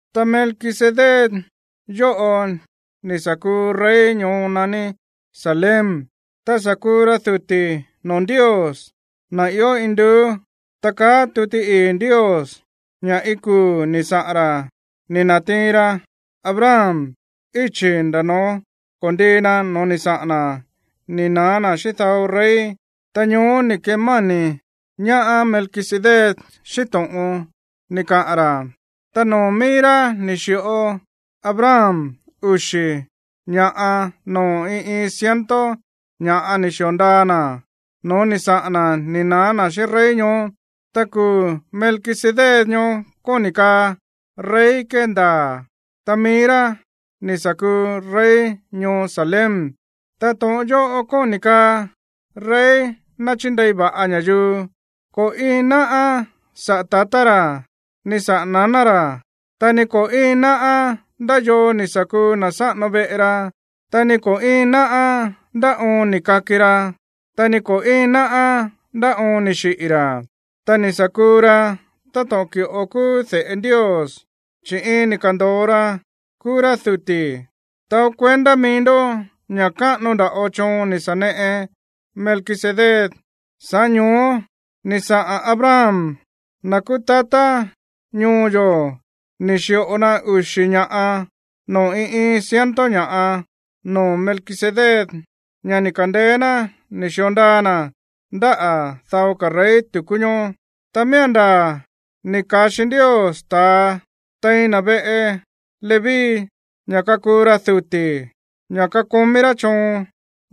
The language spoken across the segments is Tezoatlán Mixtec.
Ta Melquisedec yóꞌo ni̱ sa̱ kuu rey ñoo naní Salem, ta sa̱ kuu ra duti̱ noo̱ Ndios, na̱ ió induú. Ta kaá tuti ii̱ Ndios ña̱ iin kuu̱ ni̱ saꞌa̱n ra̱ ni̱ na̱tiin ra Abraham íchi̱ nda̱ no̱ó ko̱ndii na no̱ó ni̱ saꞌa̱n na̱ ni̱ na̱á na̱ xíꞌín dao rey, ta ñoó ni̱ kemáni̱ ñaá Melquisedec xíꞌín to̱ꞌon ni̱ kaꞌa̱n ra̱. Ta noo̱ mií rá ni̱ xi̱ꞌo Abraham uxi̱ ña̱ꞌa noo̱ iin iin ciento ña̱ ni̱ xi̱o ndaa na̱ no̱ó ni̱ saꞌa̱n na̱ ni̱ na̱á ná xíꞌín rey ñoó. Ta kuu̱ Melquisedec ñoó kóni̱ kaá “rey kéndaa̱”. Ta mií rá ni̱ sa̱ kuu rey ñoo Salem, ta to̱ꞌon yóꞌo kóni̱ kaa “rey náchíndei va̱ꞌa ña̱yuu”. Ko̱ íin náꞌá saꞌa̱ tatá ra̱, ni saꞌa̱ naná ra̱, ta ni ko̱ íin náꞌá ndá yoo ni̱ sa̱ kuu na̱ sáꞌano veꞌe ra, ta ni ko̱ íin náꞌá ndá oon ni̱ kaki ra, ta ni ko̱ íin náꞌá ndá oon ni̱ xiꞌi̱ ra̱. Ta ni̱ sa̱ kuu ra táto̱ꞌon ki̱ꞌo kúú de̱ꞌe Ndios, chi̱ iin ni̱ ka̱ndo̱o ra kúú rá duti̱. Taó kuendá mií ndó ña̱ káꞌano nda̱ꞌo choon ni̱ sa̱ neꞌe Melquisedec, sa̱ꞌá ño̱ó ni̱ saꞌa̱n Abraham, na̱ kúú tatá ñoo yo̱, ni̱ xi̱ꞌo na uxi̱ ña̱ꞌa noo̱ iin iin ciento ña̱ꞌa noo̱ Melquisedec, ña̱ ni̱ ka̱ndeé ná ni̱ xi̱o ndaa na̱ ndáꞌa̱ dao ka̱ rey tu̱kú ñoó. Ta miía̱n ndaa̱ ni̱ ka̱xi Ndios ta̱a tein na̱ veꞌe Leví ña̱ kakuu ra duti̱, ña̱ kakomí rá choon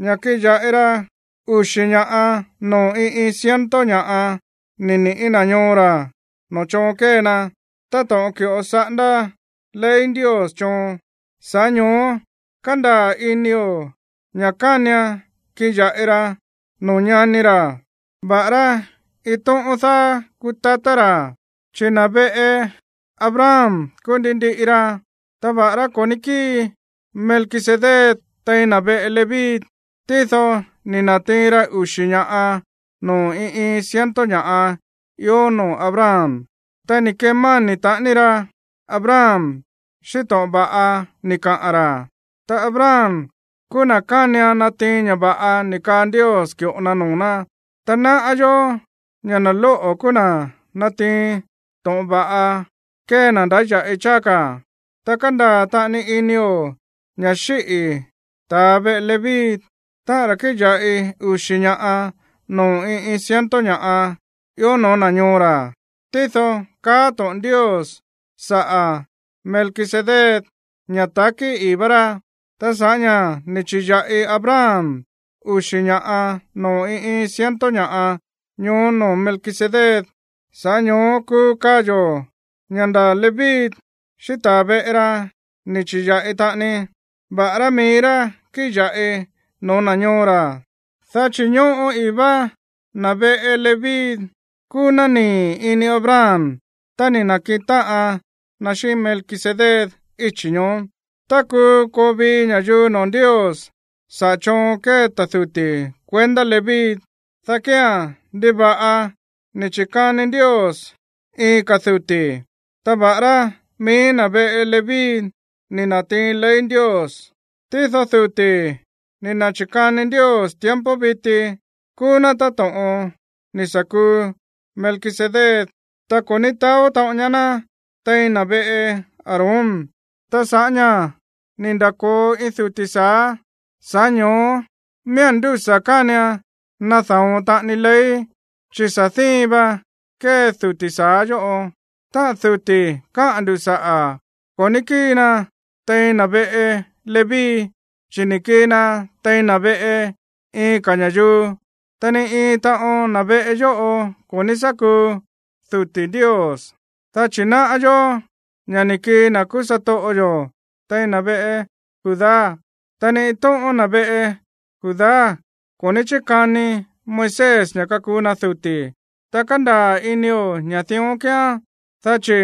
ña̱ kiꞌin ya̱ꞌi ra uxi̱ ña̱ꞌa noo̱ iin iin ciento ña̱ꞌa níꞌi̱ na̱ ñoo ra̱ noo̱ choon kée na, táto̱ꞌon ki̱ꞌo saꞌándá ley Ndios choon. Sa̱ꞌá ño̱ó kándaa̱ inio̱ ña̱ kánian kiꞌin ya̱ꞌi ra noo̱ ñani ra̱, va̱ꞌará iin tóꞌón dáá kúú tatá ra̱, chi̱ na̱ veꞌe Abraham kúú ndi ndiꞌi ra. Ta va̱ꞌará ko̱ ní kíi Melquisedec tein na̱ veꞌe Leví, tído ni̱ na̱tiin ra uxi̱ ña̱ꞌa noo̱ iin iin ciento ña̱ ió noo̱ Abraham, ta ni̱ kemáni̱ taꞌani ra Abraham xíꞌín to̱ꞌon va̱ꞌa ni̱ kaꞌa̱n ra̱. Ta Abraham kúú na̱ kánian natiin ña̱ va̱ꞌa ni̱ kaa Ndios ki̱ꞌo na noo̱ ná. Ta náꞌá yó ña̱ na̱ lóꞌo̱ kúú na̱ nátiin to̱ꞌon va̱ꞌa kée na̱ ndáya̱ꞌi cháá ka̱. Ta kándaa̱ taꞌani inio̱ ña̱ xíꞌi̱ ta̱ veꞌe Leví, táꞌa̱n ra̱ kíꞌin ya̱ꞌi uxi̱ ña̱ꞌa noo̱ iin iin ciento ña̱ꞌa ió no̱ó na̱ ñoo ra̱, tído káꞌa̱n to̱ꞌon Ndios saꞌa̱ Melquisedec ña̱ ta̱kí ii̱ vá rá. Ta sa̱ꞌá ña̱ ni̱ chi̱ya̱ꞌi Abraham uxi̱ ña̱ꞌa noo̱ iin iin ciento ña̱ꞌa ñoó noo̱ Melquisedec, sa̱ꞌá ño̱ó kuu kaa yo̱ ña̱ nda̱ Leví xíꞌín ta̱ veꞌe ra ni̱ chi̱ya̱ꞌi taꞌani, va̱ꞌará mií rá kíꞌin ya̱ꞌi no̱ó na̱ ñoo ra̱. Dá chi̱ ñóꞌo ii̱ vá na̱ veꞌe Leví kúú ná nii̱ ini Abraham tá ni̱ na̱kiꞌin táꞌan na xíꞌín Melquisedec íchi̱ ñoó. Tá kuu koo vii ña̱yuu noo̱ Ndios saꞌa̱ choon kée ta̱ duti̱ kuendá Leví, dá kía̱n, ¿ndiva̱ꞌa ni̱ chi̱kani Ndios iin ka̱ duti̱? Ta va̱ꞌará mií na̱ veꞌe Leví ni̱ na̱tiin ley Ndios, tído duti̱ ni̱ na̱chi̱kani Ndios tiempo viti kúú ná táto̱ꞌon ni̱ sa̱ kuu Melquisedec, ta ko̱ ní taó taꞌon ñaá ná tein na̱ veꞌe Aarón. Ta sa̱ꞌá ña̱ ni̱ nda̱ko̱o iin duti̱ sa̱á, sa̱ꞌá ño̱ó miía̱n ndúsa̱ kánian nada̱on taꞌani ley, chi̱ sa̱ díin va kée duti̱ sa̱á yóꞌo. Táꞌa̱n duti̱ káꞌa̱n ndu̱ saꞌa̱, ko̱ ní kíi na tein na̱ veꞌe Leví, chi̱ ni̱ kii na tein na̱ veꞌe iin ka̱ ña̱yuu, ta ni iin taꞌon na̱ veꞌe yóꞌo ko̱ ní sá kuu duti̱ Ndios. Dá chi̱ náꞌá yó ña̱ ni̱ kii na̱ kúú satoꞌo yo̱ tein na̱ veꞌe Judá, ta ni iin tóꞌón na̱ veꞌe Judá ko̱ ní chíkani Moisés ña̱ kakuu na duti̱. Ta kándaa̱ inio̱ ña̱ dión kíán, dá chi̱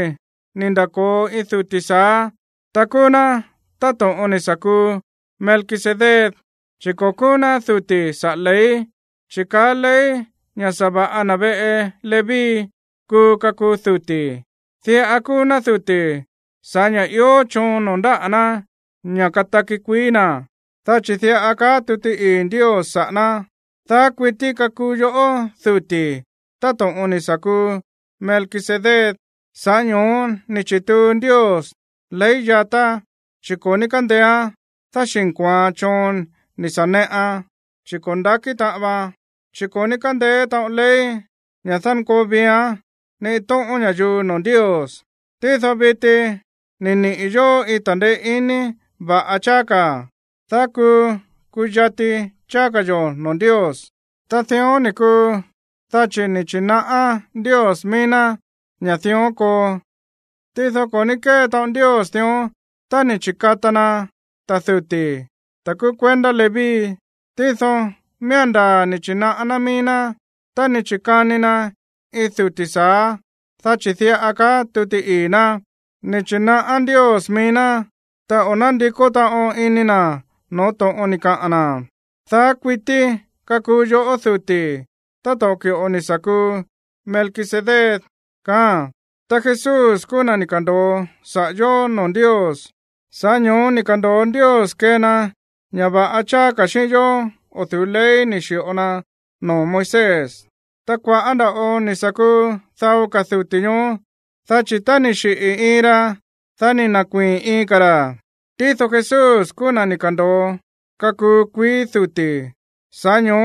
ni̱ nda̱ko̱o iin duti̱ sa̱á, ta kúú ná táto̱ꞌon ni̱ sa̱ kuu Melquisedec. Chi̱ ko̱ kúú ná duti̱ saꞌa̱ ley, chi̱ kaá ley ña̱ sa̱va̱ꞌa na̱ veꞌe Leví kuu kakuu duti̱. Diꞌa kúú ná duti̱ sa̱ꞌá ña̱ ió choon noo̱ ndáꞌa̱ ná ña̱ kataki kuií na̱. Dá chi̱ diꞌa kaá tuti ii̱ Ndios saꞌa̱ ná: Daá kuití kakuu yoꞌó duti̱, táto̱ꞌon ni̱ sa̱ kuu Melquisedec. Sa̱ꞌá ño̱ó ni̱ chi̱tuu Ndios ley yatá, chi̱ ko̱ ní kándeéán dáxi̱nko̱oan choon ni̱ sa̱ neꞌan, chi̱ ko̱ nda̱kí taꞌan vaan, chi̱ ko̱ ní kándeé taꞌon ley ña̱ dánkoo viián ni iin tóꞌón ña̱yuu noo̱ Ndios. Tído viti ni̱ niꞌi̱ yo̱ iin ta̱ndeé iní va̱ꞌa cháá ka̱, dá kuu kuyati cháá ka̱ yo̱ noo̱ Ndios. Ta dión ni̱ kuu, dá chi̱ ni̱ chi̱naꞌá Ndios mií ná ña̱ dión koo. Tído ko̱ ní kée taꞌon Ndios dión tá ni̱ chi̱kata na ta̱ duti̱, ta̱ kúú kuendá Leví. Tído miía̱n ndaa̱ ni̱ chi̱naꞌá ná mií ná tá ni̱ chi̱kani na iin duti̱ sa̱á, dá chi̱ diꞌa kaá tuti ii̱ ná: Ni̱ chi̱naꞌá Ndios mií ná, ta o̱ nándikó taꞌon iní na̱ no̱ó to̱ꞌon ni̱ kaꞌa̱n na̱: “Daá kuití kakuu yoꞌó duti̱, táto̱ꞌon ki̱ꞌo ni̱ sa̱ kuu Melquisedec.” Ta Jesús kúú na̱ ni̱ ka̱ndo̱o saꞌa̱ yo̱ noo̱ Ndios, sa̱ꞌá ño̱ó ni̱ ka̱ndo̱o Ndios kee na ña̱ va̱ꞌa cháá ka̱ xíꞌín yó o̱ du̱ú ley ni̱ xi̱ꞌo na noo̱ Moisés. Ta kua̱ꞌá nda̱ꞌo ni̱ sa̱ kuu dao ka̱ duti̱ ñoó, dá chi̱ tá ni̱ xiꞌi̱ iin ra, dá ni̱ na̱kuíi̱n iin ka̱ ra̱. Tído Jesús kúú na̱ ni̱ ka̱ndo̱o kakuu kuií duti̱, sa̱ꞌá ño̱ó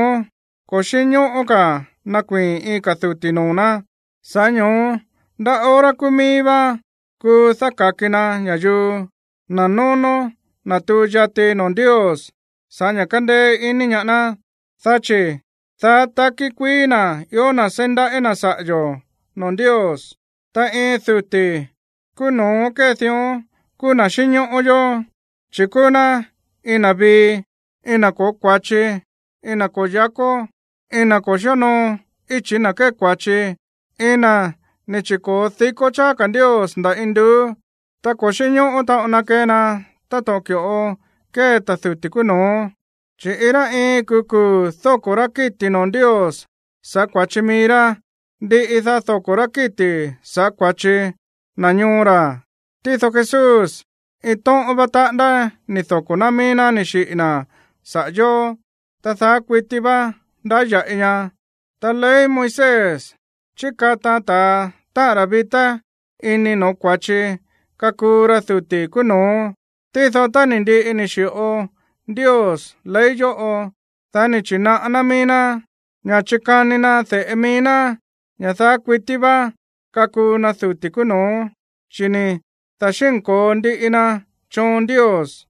ko̱ xínñóꞌó ka̱ nakuii̱n iin ka̱ duti̱ noo̱ ná. Sa̱ꞌá ño̱ó ndá hora kúú mií vá kuu dáka̱ki na ña̱yuu, na̱ nónó natuu yati noo̱ Ndios sa̱ꞌá ña̱ kándéé iní ñaá ná, dá chi̱ daá takí kuií na̱ ió na̱ seí ndaꞌí na̱ saꞌa̱ yo̱ noo̱ Ndios. Ta iin duti̱ kúú no̱ó kée dión kúú na̱ xínñóꞌó yó, chi̱ kúú ná iin na̱ vii, iin na̱ ko̱ó kua̱chi, iin na̱ ko̱ó yáko̱, iin na̱ ko̱ xíonoo íchi̱ na̱ kée kua̱chi, iin na̱ ni̱ chi̱ko̱o dikó cháá ka̱ Ndios nda̱ induú. Ta ko̱ xínñóꞌó taꞌon na kee na táto̱ꞌon ki̱ꞌo kée ta̱ duti̱ kúú no̱ó, chi̱ iin rá iin kuu̱ kuu̱ dóko̱ rá kíti̱ noo̱ Ndios sa̱ꞌá kua̱chi mií rá, ndiꞌi, dá dóko̱ rá kíti̱ sa̱ꞌá kua̱chi na̱ ñoo ra̱. Tído Jesús, iin tóꞌón vá taꞌándá ni̱ doko̱ ná mií ná ni̱ xiꞌi̱ na̱ saꞌa̱ yó, ta daá kuití vá ndáya̱ꞌi ña. Ta ley Moisés chíkataan ta̱a, táꞌa̱n ra̱ vitá ini no̱ó kua̱chi, kakuu ra duti̱ kúú no̱ó. Tído tá ni̱ ndiꞌi ni̱ xi̱ꞌo Ndios ley yóꞌo, dá ni̱ na̱chi̱naꞌá ná mií ná ña̱ chikani na de̱ꞌe mií ná ña̱ daá kuití vá kakuu na duti̱ kúú no̱ó, chi̱ ni̱ da̱xínko̱o ndiꞌi na choon Ndios.